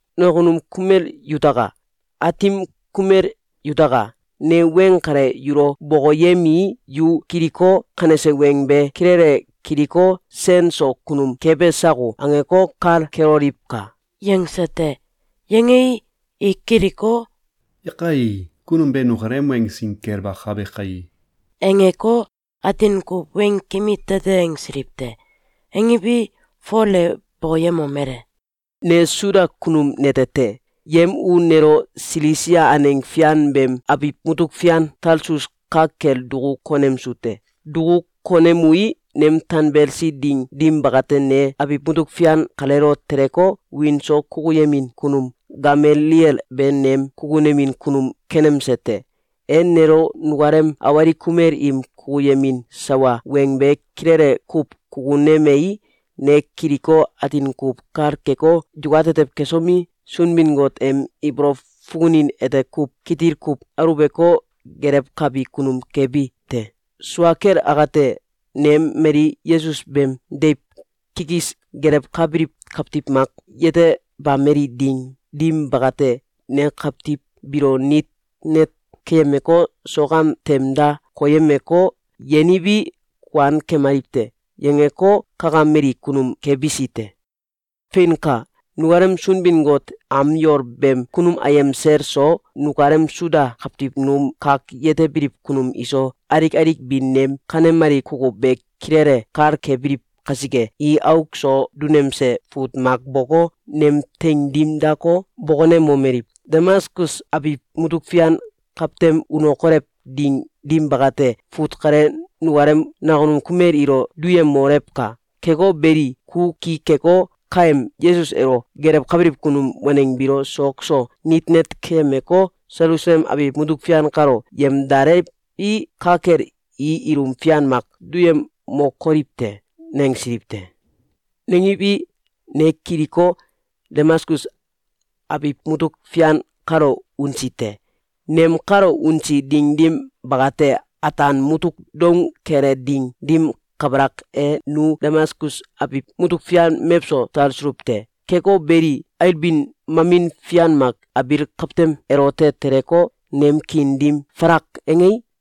“Nakunum kumel yutaka! Aatim kumel yutaka! Ne weng kale yulo bokoyemii, yu kiliko, kanese weng be kilele kiliko, ‘Sen so kunum kebe sako?’, angeko, kal keloliwka!”, yangse te. Yangei, i kiliko, “Yakai! Kunum be nukalem weng sin kel bakabe kai!”, angeko, atin kuw weng kimi tete angsiliw te. Angiwi, Fol e bokoyemomele: “Ne Suda kunum nete te. Yem u nelo Silisia aneng fian beem abiw mutuk fian Talsus ka kel duku konemsu te. Duku konemui, nem tanbelsi ding dim bakate, ne abiw mutuk fian kaleelo teleko, wiin so kukuyemin kunum Gamaliel be nem kukunemin kunum kenemse te. E nelo nukalem awalik kumel im kukuyemin sawa weng be kilele kuw kukunemei, ne kiliko, atin kuw kal keko, yukatetew kesomi, Sunbin-Got em ibolow fukunin ete kuw kitil kuw aluweko, gelewkabi kunum kebi te. Sua kel akate, nem mali Yesus beem deiw kikis gelewkabiliw kawtiw mak yetebameli ding dim bakate, ne kawtiw biilo nit net keyemeko, sok am tem da koyemeko, ‘Yeniwi, kuan kemaliw te!’, yangeko, kakameli kunum kebisi te. Feinka! Nukalem Sunbin-Got am yol beem kunum ayem sel so, nukalem Suda kawtiw num kak yetebiliw kunum iso, alik alik bi nem kanemali kukuw be kilele kal kebiliw kasike, i auk so dunemse fut mak boko, nem teing dim dako, bokonemomeliw: ‘Damaskus abiw mutuk fian kawtem unokolew ding dim bakate, fut kale nukalem nakunum kumel ilo duyemolewka! Keko beli, ku ki keko, kaem Yesus elo gelewkabiliw kunum waneng biilo sok so nit net keyemeko, Selusalem abiw mutuk fian kalo yemdalewi, ka kel i ilum fian mak duyemokoliw te.’, nangsiliw te. Nangiwi, ne kiliko, Damaskus abiw mutuk fian kalo unsi te. Nem kalo unsi ding dim bakate, ataan mutuk doung kele ding dim kabalak e, nu Damaskus abiw mutuk fian mewso talsuluw te. Keko beli, ailbin mamin fian mak abiil kawtem elote teleko, nem kiin dim falak angei,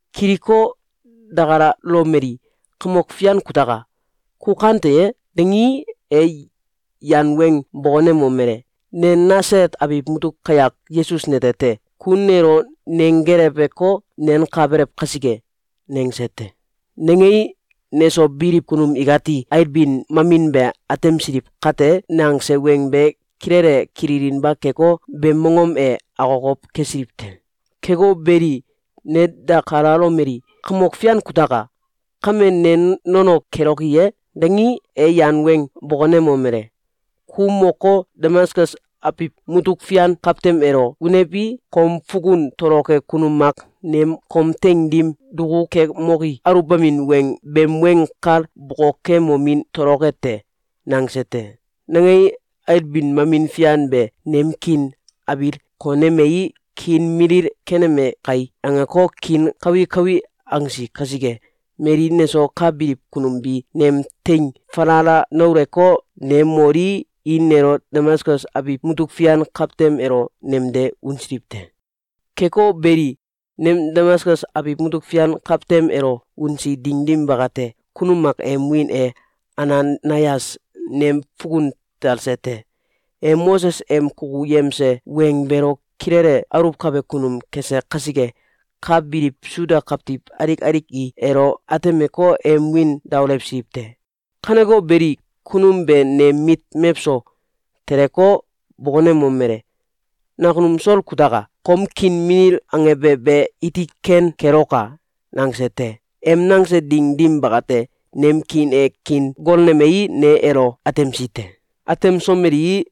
Kiliko, dakalalomeli: ‘Kamok Fian kutaka! Ku kante ye?’, dangii, e yan weng bokonemomele: ‘Ne Nasalet abiw mutuk kayak Yesus nete te. Ku nelo nenggeleweko, nenkabelew kasike.’, nangse te. Nangei, neso biliw kunum ikati ailbin mamin be atemsiliw kate, nangse weng be kilele kilinba keko, beem mongom e akokow kesiliw te. Keko beli, ne dakalalomeli: ‘Kamok Fian kutaka! Kame, ne nono keloki ye?’, dangii, e yan weng bokonemomele: ‘Ku moko, Damaskus abiw mutuk fian kawtem elo unewi, kom fukun toloke kunum mak nem kom teing dim dukukemoki aluwbamin beem weng kal bokokemomin toloke te!’, nangse te. Nangei, ailbin mamin fian be nem kiin abil konemei, ‘Kiin milil keneme kai!’, angeko, kiin kawi kawi angsi kasike, mali neso ka biliw kunum bi nem teing falala nauleko, ne molii, i nelo Damaskus abiw mutuk fian kawtem elo nemde unsiliw te. Keko beli, nem Damaskus abiw mutuk fian kawtem elo unsi ding dim bakate, kunum mak em wiin e Ananayas nem fukun talse te. E Moses em kukuyemse weng beelo kilele aluwkabe kunum kese kasike, ka biliw Suda kawtiw alik alik i elo atemeko, em wiin daolewsiliw te. Kaneko beli, kunum be nem mit mewso teleko, bokonemomele: ‘Nakunum Sol kutaka! Kom kiin milil angebe be iti ken keloka!’, nangse te. Em nangse ding dim bakate, nem kiin e kiin golnemei, ne elo atemsi te. Atemsomelii,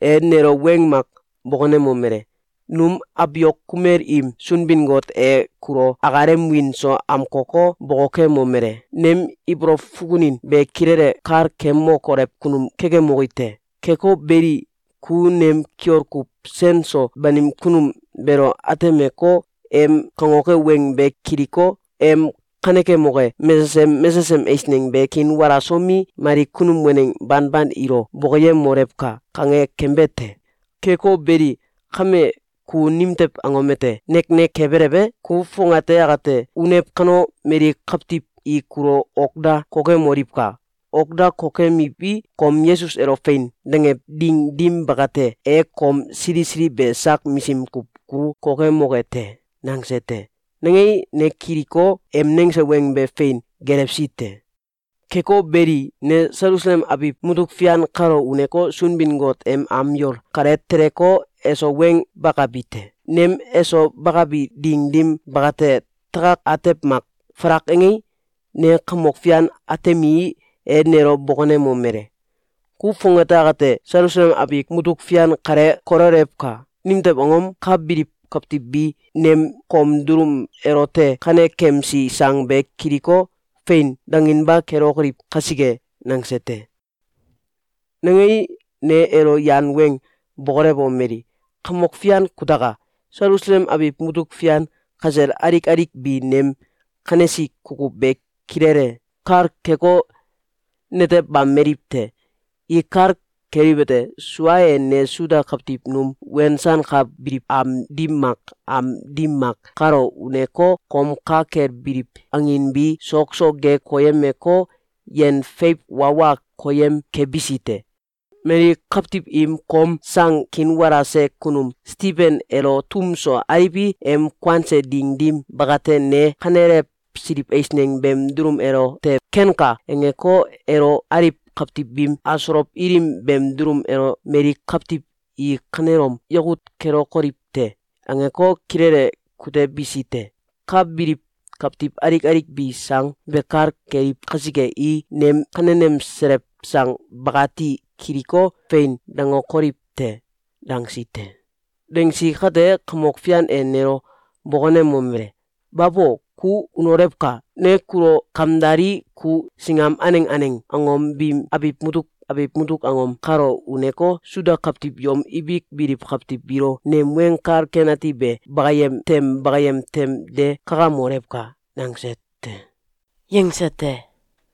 e nelo weng mak bokonemomele: ‘Num abiok kumel im Sunbin-Got e kulo akalem wiin so amkoko, bokokemomele: ‘Nem ibolow fukunin be kilele kal kemokolew kunum kekemoki te. Keko beli, ku nem Kiol Kuw Sen so Banim Kunum beelo atemeko, em kangoke weng be kiliko, em kanekemoke mesesem mesesem eisneng be kiinwalasomi, mali kunum waneng banban ilo bokoyemolewka!’, kange kembe te. Keko beli, kame, ku nimtew angom ete neknek kebelew e? Ku fongate akate unew kano, mali kawtiw i kulo ok da kokemoliwka! Ok da kokemiwi, kom Yesus elo ‘Fein!’, dangew ding dim bakate, e kom sili sili be sak misim kuw kulu kokemoke te.’, nangse te. Nangei, ne kiliko, em nangse weng be fein gelewsi te. Keko beli, ne Selusalem abiw mutuk fian kalo uneko, Sunbin-Got em am yol kale teleko, eso weng bakabi te. Nem eso bakabi ding dim bakate, takak atew mak falak angei, ne Kamok Fian atemii, e nelo bokonemomele: ‘Ku fongate akate Selusalem abiw mutuk fian kale kololewka! Nimtew angom? Ka biliw kawtiw bi nem kom dulum elote kanekemsi sang be kiliko, ‘Fein!’, danginba kelokoliw kasike.’, nangse te. Nangei, ne elo yan weng bokolewomeli: ‘Kamok Fian kutaka! Selusalem abiw mutuk fian kasel alik alik bi nem kanesi kukuw be kilele kal keko, netebameliw te. I kal keliwete: Sua e, ne Suda kawtiw num wensankabiliw am dim mak am dim mak kalo uneko, kom ka kel biliw angin bi sok so ge koyemeko, yen feiw wa wa koyem kebisi te. Mali kawtiw im kom sang kiinwalase kunum Stiben elo tum so aliwi, em kuanse ding dim bakate, ne kanelewsiliw eisneng beem dulum elote ‘Kenka!’, angeko, elo aliw kawtiw biim asolow ilim beem dulum elo ‘Mali kawtiw i kanelom yakut kelokoliw te!’, angeko, kilele kutebisi te. Ka biliw kawtiw alik alik bi sang be kal keliw kasike, i nem kanenemselew sang bakati kiliko, “Fein!”, dangokoliw te!’, dangsi te. Dangsi kate, Kamok Fian e nelo bokonemomele: ‘Babo! Ku unolewka! Ne kulo kamdalii, ku singam aneng aneng angom biim abiw mutuk abiw mutuk angom kalo uneko, Suda kawtiw yom ibik biliw kawtiw biilo nem Weng Kal Ken Ati be bakayem tem bakayem tem de kakamolewka!’, nangse te.”, yangse te.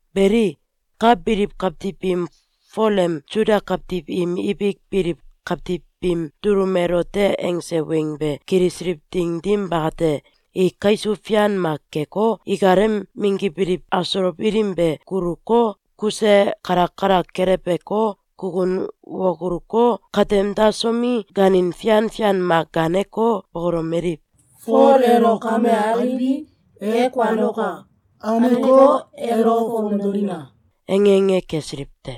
Beli, ka biliw kawtiw biim Fol em Suda kawtiw im ibik biliw kawtiw biim dulum elote angse weng be kilisiliw ding dim bakate, i kaisuw fian mak keko, ikalem minggibiliw asolow ilim be guluko, kuse kalak kalak keleweko, kukun wakuluko, katem dasomi, gaanin fian fian mak gaaneko, bokolomeliw: “Fol elo kame aliwi, e kuanoka! Aneko, elo fomdolina!”, ange ange kesiliw te.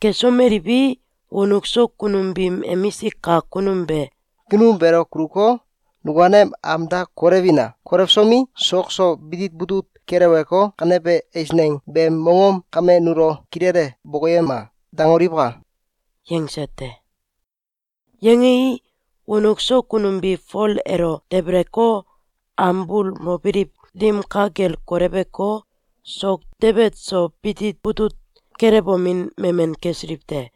Kesomeliwi, wonuk so kunum biim emisik kak kunum be “Kunum beelo kuluko, nukalem am da kolewina! Kolewsomi, sok so bitit butut keleweko, ‘Kanebe eisneng beem mongom kame nulo kilele bokoyema!’, dangoliwka!”, yangse te. Yangei, wonuk so kunum bi Fol elo debeleko, am bul mobiliw dim ka kel koleweko, sok debet so bitit butut kelewomin memen kesiliw te.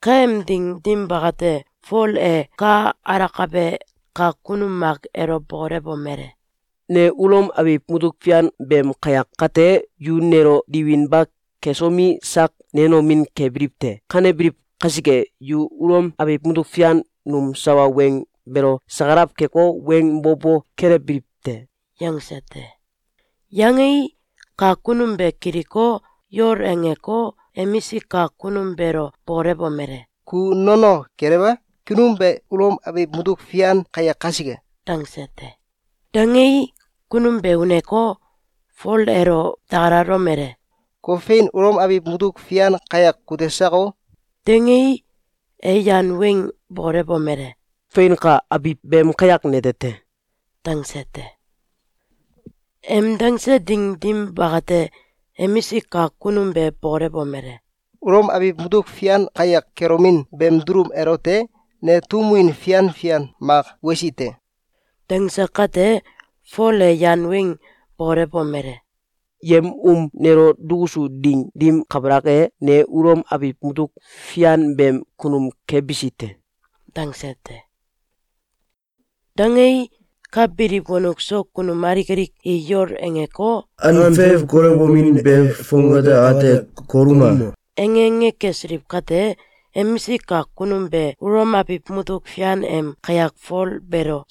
Kaem ding dim bakate, Fol e ka alakabe kak kunum mak elo bokolewomele: “Ne Ulom abiw mutuk fian beem kayak kate, yu nelo diwinba kesomi, sak nenomin kebiliw te. Kanebiliw kasike, yu Ulom abiw mutuk fian num sawa weng beelo sakalaw keko, weng bo bo kelewbiliw te!”, yangse te. Yangei, kak kunum be kiliko, yol angeko, emisik kak kunum beelo bokolewomele: “Ku nono kelew e? Kunum be Ulom abiw mutuk fian kayak kasike!”, dangse te. Dangei, kunum be uneko, Fol elo dakalalomele: “Ku fein Ulom abiw mutuk fian kayak kute sako?”, dangei, e yan weng bokolewomele: “Feinka! Abiw beem kayak nete te.”, dangse te. Em dangse ding dim bakate, emisik kak kunum be bokolewomele: “Ulom abiw mutuk fian kayak kelomin beem dulum elote, ne tum win fian fian mak wesi te.”, dangse kate, Fol e yan weng bokolewomele: “Yem um nelo dukusu ding dim kabalak e, ne Ulom abiw mutuk fian beem kunum kebisi te.”, dangse te. Dangei, ka biliw wonuk so kunum alik alik i yol angeko, “An feiw kolewomin be fongate akate koluma!”, ange ange kesiliw kate, emisik kak kunum be Ulom abiw mutuk fian em kayak Fol beelo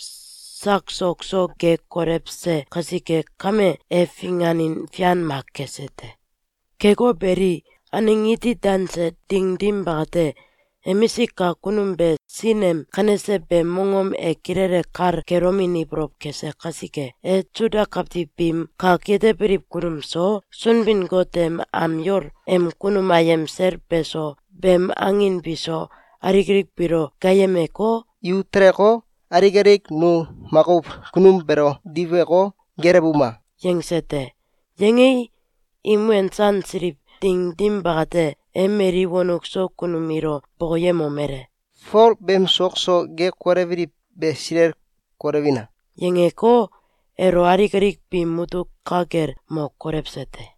sak sok so ge kolewse kasike kame, e finganin fian mak kese te. Keko beli, aneng iti danse ding dim bakate, emisik kak kunum be sin em kanese beem mongom e kilele kal kelomin ibolow kese kasike, e Suda kawtiw biim kak yetebiliw kunum so, Sunbin-Got em am yol em kunum ayem sel beso, beem angin biso, alik alik biilo gaayemeko, “Yu teleko, alik alik nu makuw kunum beelo diweko, geelewuma!”, yangse te. Yangei, im wensansiliw ding dim bakate, e mali wonuk so kunum ilo bokoyemomele: “Fol beem sok so ge kolewbiliw be silel kolewina!”, yangeko, elo alik alik biim mutuk ka kel mo kolewse te.